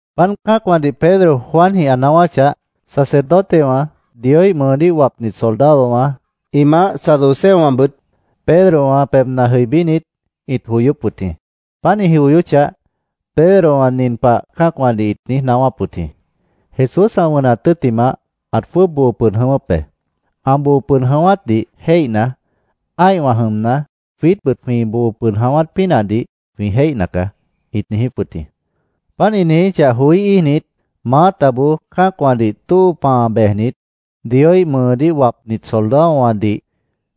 Páant cã́acwãdih Pedro Juanjĩh ĩ naáwáchah, sacerdotewã, Dioíh mʉʉdíh wapnit soldadowã ĩ maáh, saduceowãbʉt Pedrowã pebhna jʉibínit, ĩt joyóp wʉt jĩ. Páant ĩ joyóchah, Pedrowã nin pah cã́acwãdih ĩt niíj naáwáp wʉt jĩ: “Jesús ã wʉnat tʉ́ttimah, ãt jwʉ́ʉb boo pʉd jʉ̃ʉ́wʉ́p be. Ã boo pʉd jʉ̃ʉ́wátdih jéihna, ã́ihwã jʉmna, jwiítbʉt jwĩ boo pʉd jʉ̃ʉ́wát pínahdih jwĩ jéihna caá”, ĩt niijíp wʉt jĩ. Páant ĩ niijíchah joí íijnit, maátaboó cã́acwãdih tóo pãa bejnit, Dioíh mʉʉdíh wapnit soldadowãdih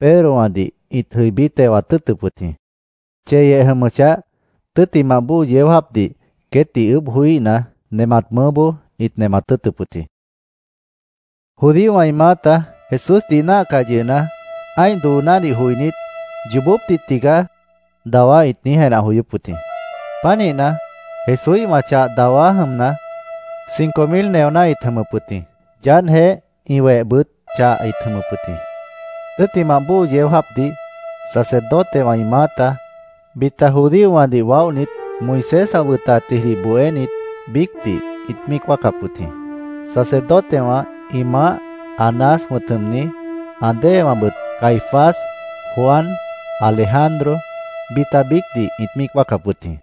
Pedrowãdih ĩt jʉibí tewat tʉ́ʉtʉp wʉt jĩ. Cheyeh jʉmʉchah, tʉ́ttimah bóo yeó jáapdih queétdih ʉʉ́bh joííhna, nemat mʉʉ́boó ĩt nemat tʉ́ʉtʉp wʉt jĩ. Judíowã ĩ maáta Jesúsdih ĩ náahcah yʉhna, ã́ih doonádih joinít, “Yoobópdih tigaá”, dawá ĩt niíj jenah joyóp wʉt jĩ. Pánihna, Jesúíhwã chah dawá jʉmna, cinco mil neoná ĩt jʉmʉp wʉt jĩ. Yaádhjeéh ĩ wehjeéhbʉt chah ĩt jʉmʉp wʉt jĩ. Tʉ́ttimah bóo yeó jáapdih sacerdotewã ĩ maáta, bita judíowãdih waóhnit, Moisés ã wʉtatjidih bohénit biícdih ĩt míic wáacap wʉt jĩ. Sacerdotewã ĩ maáh, Anás wʉ̃t jʉmni, ã déewãbʉt Caifás, Juan, Alejandro, bita biícdih ĩt míic wáacap wʉt jĩ.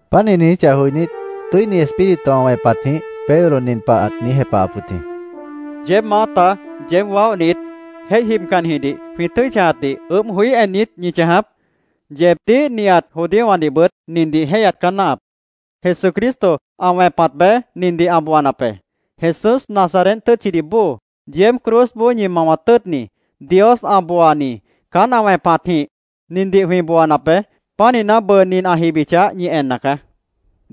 Páant ĩ niijíchah joinít, Tʉ́ini Espíritu ã wẽpatjĩh Pedro nin pah ãt niíj jepahap wʉt jĩ: —¿Yeéb maáta, yeéb waóhnit, jéih jibcannijidih jwĩ tʉ́i chãjatdih ʉʉ́bh joí en niít ñi chãjap? Yeebdíh, nihat judíowãdihbʉt nindih jéihyat caá náahap: Jesucristo ã wẽpat beé nindih ã booanap be. Jesús Nazaret tʉ́tchidih bóo, yeéb cruzboó ñi mawat tʉ́ʉtni, Dios ã booani, caán ã wẽpatjĩh nindih jwĩ booanap be. Pánihna, bʉʉ nin ã jibichah, ñi enna caá.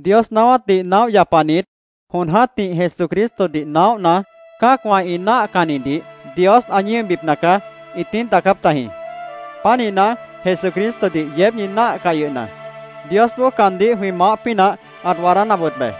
Dios naáwátdih naóh yapanit jon jã́tih Jesucristodih naóhna, ‘Cã́acwã ĩ náahcannidih Dios ã ñíobipna caá’, ĩt niíj daacáp tajĩ. Pánihna, Jesucristodih yeéb ñi náahcah yʉhna, Diosboó caandíh jwĩ maáh pínah ãt waadánap wʉt be.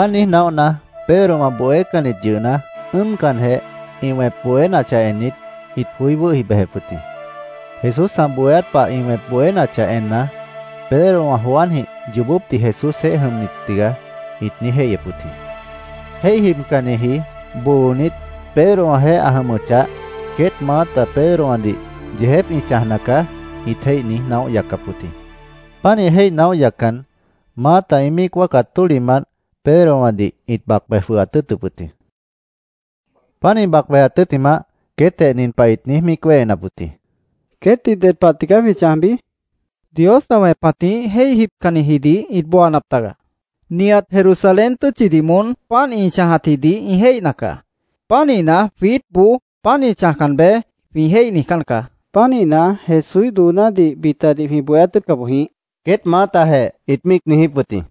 Páant niíj naóhna, Pedrowã bohécannit yʉhna, ʉ́ʉmcanjeh, ĩ wẽp bohénachah ennit, ĩt joí wʉ́hi bejep wʉt jĩ. Jesús ã bohéát pah ĩ wẽp bohénachah enna, “Pedro, Juanjĩh yoobópdih Jesúsjeéh jʉmnit tigaá”, ĩt niíj jéihyep wʉt jĩ. Jéih jibcanniji boonit, Pedrowãjeéh ã jʉmʉchah, queét maáta Pedrowãdih “Yeejép ĩ chãjna caá”, ĩt jéih niíj naóh yaccap wʉt jĩ. Pánih jéih naóh yaccan, maáta ĩ míic wáacat tólihmant Pedrowãdih ĩt bac bej jwʉhat tʉ́ʉtʉp wʉt jĩ. Páant ĩ bac bejat tʉ́ttimah, queétjeh nin pah ĩt niíj míic wéhenap wʉt jĩ: —¿Queétdih ded pah tigaá jwĩ chãjbi? Dios ã wẽpatjĩh jéih jibcannijidih ĩt booanap taga. Nihat Jerusalén tʉ́tchidih moón páant ĩ chãjatjidih ĩ jéihna caá. Pánihna, jwiítboó ‘Páant ĩ chãjcan beé’, jwĩ jéih niijcán caá. Pánihna, Jesúíh doonádih bitadih jwĩ bohéát tʉ́ʉtca boj jĩíh, queét maátajeh ĩt míic niijíp wʉt jĩ.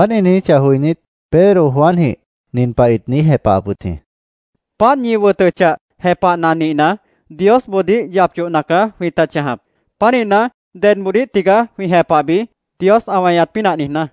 Páant ĩ niijíchah joinít, Pedro Juanjĩh nin pah ĩt niíj jepahap wʉt jĩ: —Páant ñi wʉtʉchah, jepahna nihna, Diosboodíh yap yohna caá jwĩta chãjap. ¿Pánihna, dedboodíh tigaá jwĩ jepahbi, Dios ã weñat pínah niijná?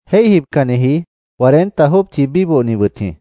Jéih jibcanniji cuarenta jópchi bíbohni wʉt jĩ.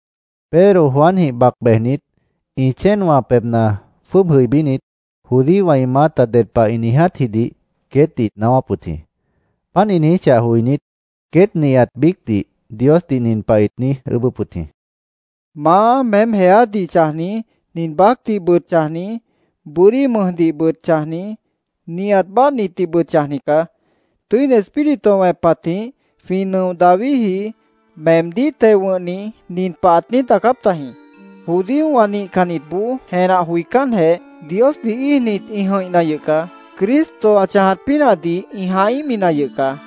Pedro Juanjĩh bac bejnit, ĩ chéenwã pebhna jwʉ́ʉb jʉibínit, judíowã ĩ maáta ded pah ĩ niijátjidih queétdih ĩt naáwáp wʉt jĩ. Páant ĩ niijíchah joinít, queét nihat biícdih Diosdih nin pah ĩt niíj ʉʉ́bʉ́p wʉt jĩ: “Maá, meém jeádih chãjni, nin baácdihbʉt chãjni, bʉ́dí mʉjdihbʉt chãjni, nihat báadhnitdihbʉt chãjni caá. Tʉ́ini Espíritu ã wẽpatjĩh jwĩ nʉo Davidji, meemdíh teo wʉ̃hni, nin pah ãt niíj daacáp tajĩ: ‘Judíowã nihcannitboó jenah joicánjeh, Diosdih íijnit, ĩ jʉ̃ihna yʉh caá. Cristo ã chãjat pínahdih ĩ jãhíhmina yʉh caá.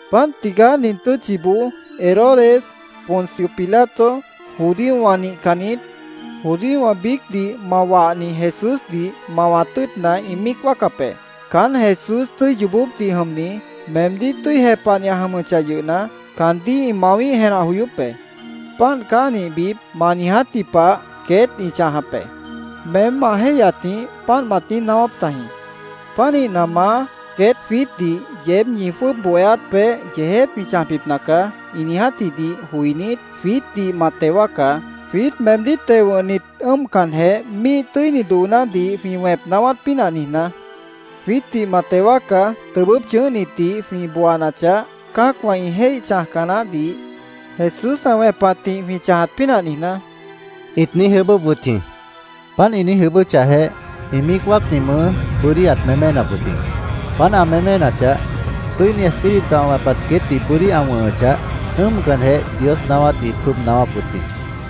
“Páant tigaá nin tʉ́tchiboó Herodes, Poncio Pilato, judíowã nihcannit, judíowã biícdih ma wahni Jesúsdih mawat tʉ́ʉtna, ĩ míic wáacap be. Caán Jesús tʉ́i yoobópdih jʉmni, meemdíh tʉ́i jepahni ã jʉmʉchah yʉhna, caandíh ĩ mawíh jenah joyóp be. ‘Páant caá ã nihbip’, ma niijátji pah queét ĩ chãjap be. Meém ma jéihyatjĩh páant mat niíj naáwáp tajĩ. Pánihna, Maá, queét jwiítdih ‘Yeéb ñi jwʉ́ʉb bohéát peéh yeejép jwĩ chãjbipna caá’, ĩ niijátjidih joinít, jwiítdih ma teo wáacá, jwiít meemdíh teo wʉ̃hnit ʉ́ʉmcanjeh, míih tʉ́ini doonádih jwĩ wẽp naáwát pínah niijná. Jwiítdih ma teo wáacá, tʉbʉ́p chʉ̃ʉ́hnitdih jwĩ booanachah, cã́acwã ĩ jéih chãjca naáhdih Jesús ã wẽpatjĩh jwĩ chãjat pínah niijná”, ĩt niíj ʉʉ́bʉ́p wʉt jĩ. Páant ĩ niíj ʉʉ́bʉ́chahjeh, ĩ míic wáacni mʉʉ́ bʉ́dí ãt méménap wʉt jĩ. Páant ã méménachah, Tʉ́ini Espíritu ã wẽpat queétdih bʉ́dí ã wʉ̃hʉchah, ʉ́ʉmcanjeh Dios naáwátdih ĩt jwʉ́ʉb naáwáp wʉt jĩ.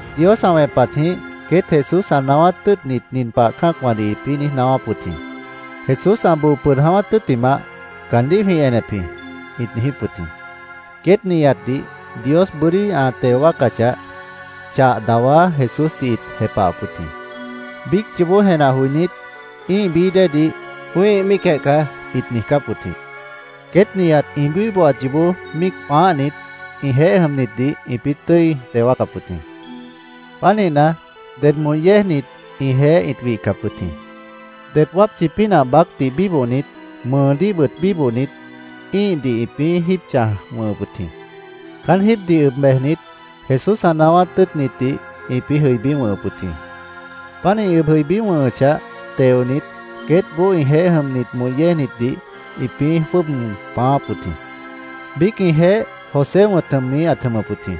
Dios ã wẽpatjĩh queét Jesús ã naáwát tʉ́ʉtnit nin pah cã́acwãdih ĩpĩ́ niíj naáwáp wʉt jĩ: “Jesús ã boo pʉd jʉ̃ʉ́wát tʉ́ttimah caandíh jwĩ enep jĩ”, ĩt niijíp wʉt jĩ. Queét nihatdih Dios bʉ́dí ã teo wáacachah, chah dawá Jesúsdih ĩt jepahap wʉt jĩ. Biíc yoobó jenah joinít, ĩ́ih bií déedih “Wĩ́ih míicjeh caá”, ĩt niijcáp wʉt jĩ. Queét nihat ĩ bíbohat yoobó míic pãáhnit, ĩjeéh jʉmnitdih ĩpĩ́ tʉ́i teo wáacap wʉt jĩ. Pánihna, ded moh yéejnit ĩjeéh ĩt wihcap wʉt jĩ. Det wápchi pínah baácdih bíbohnit, mʉʉdíhbʉt bíbohnit, ĩ́ihdih ĩpĩ́ jíib chãj wʉ̃hʉp wʉt jĩ. Caán jíibdih ʉb bejnit, Jesús ã naáwát tʉ́ʉtnitdih ĩpĩ́ jʉibí wʉ̃hʉp wʉt jĩ. Páant ĩ ʉb jʉibí wʉ̃hʉchah, teonit, queétboó ĩjeéh jʉmnit moh yéejnitdih ĩpĩ́ jwʉ́ʉb pãááp wʉt jĩ. Biíc ĩjeéh José wʉ̃t jʉmni ãt jʉmʉp wʉt jĩ.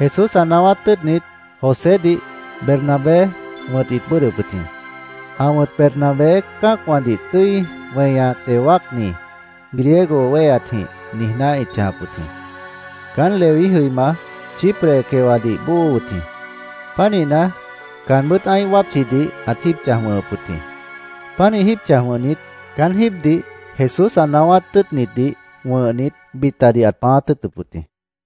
Jesús ã naáwát tʉ́ʉtnit Josédih Bernabé wʉ̃t ĩt bʉ́ʉdhdʉp wʉt jĩ. Ã wʉ̃t Bernabé “Cã́acwãdih tʉ́i weña teo wáacni”, Griego wéheatjĩh niijná ĩt chãjap wʉt jĩ. Caán Leví jʉima, Chipre quewadih bóo wʉt jĩ. Pánihna, caanbʉ́t ã́ih wápchidih ãt jíib chãjap wʉ̃hʉp wʉt jĩ. Pánih jíib chãj wʉ̃hnit, caán jíibdih Jesús ã naáwát tʉ́ʉtnitdih wʉ̃hnit, bitadih ãt pãáát tʉ́ʉtʉp wʉt jĩ.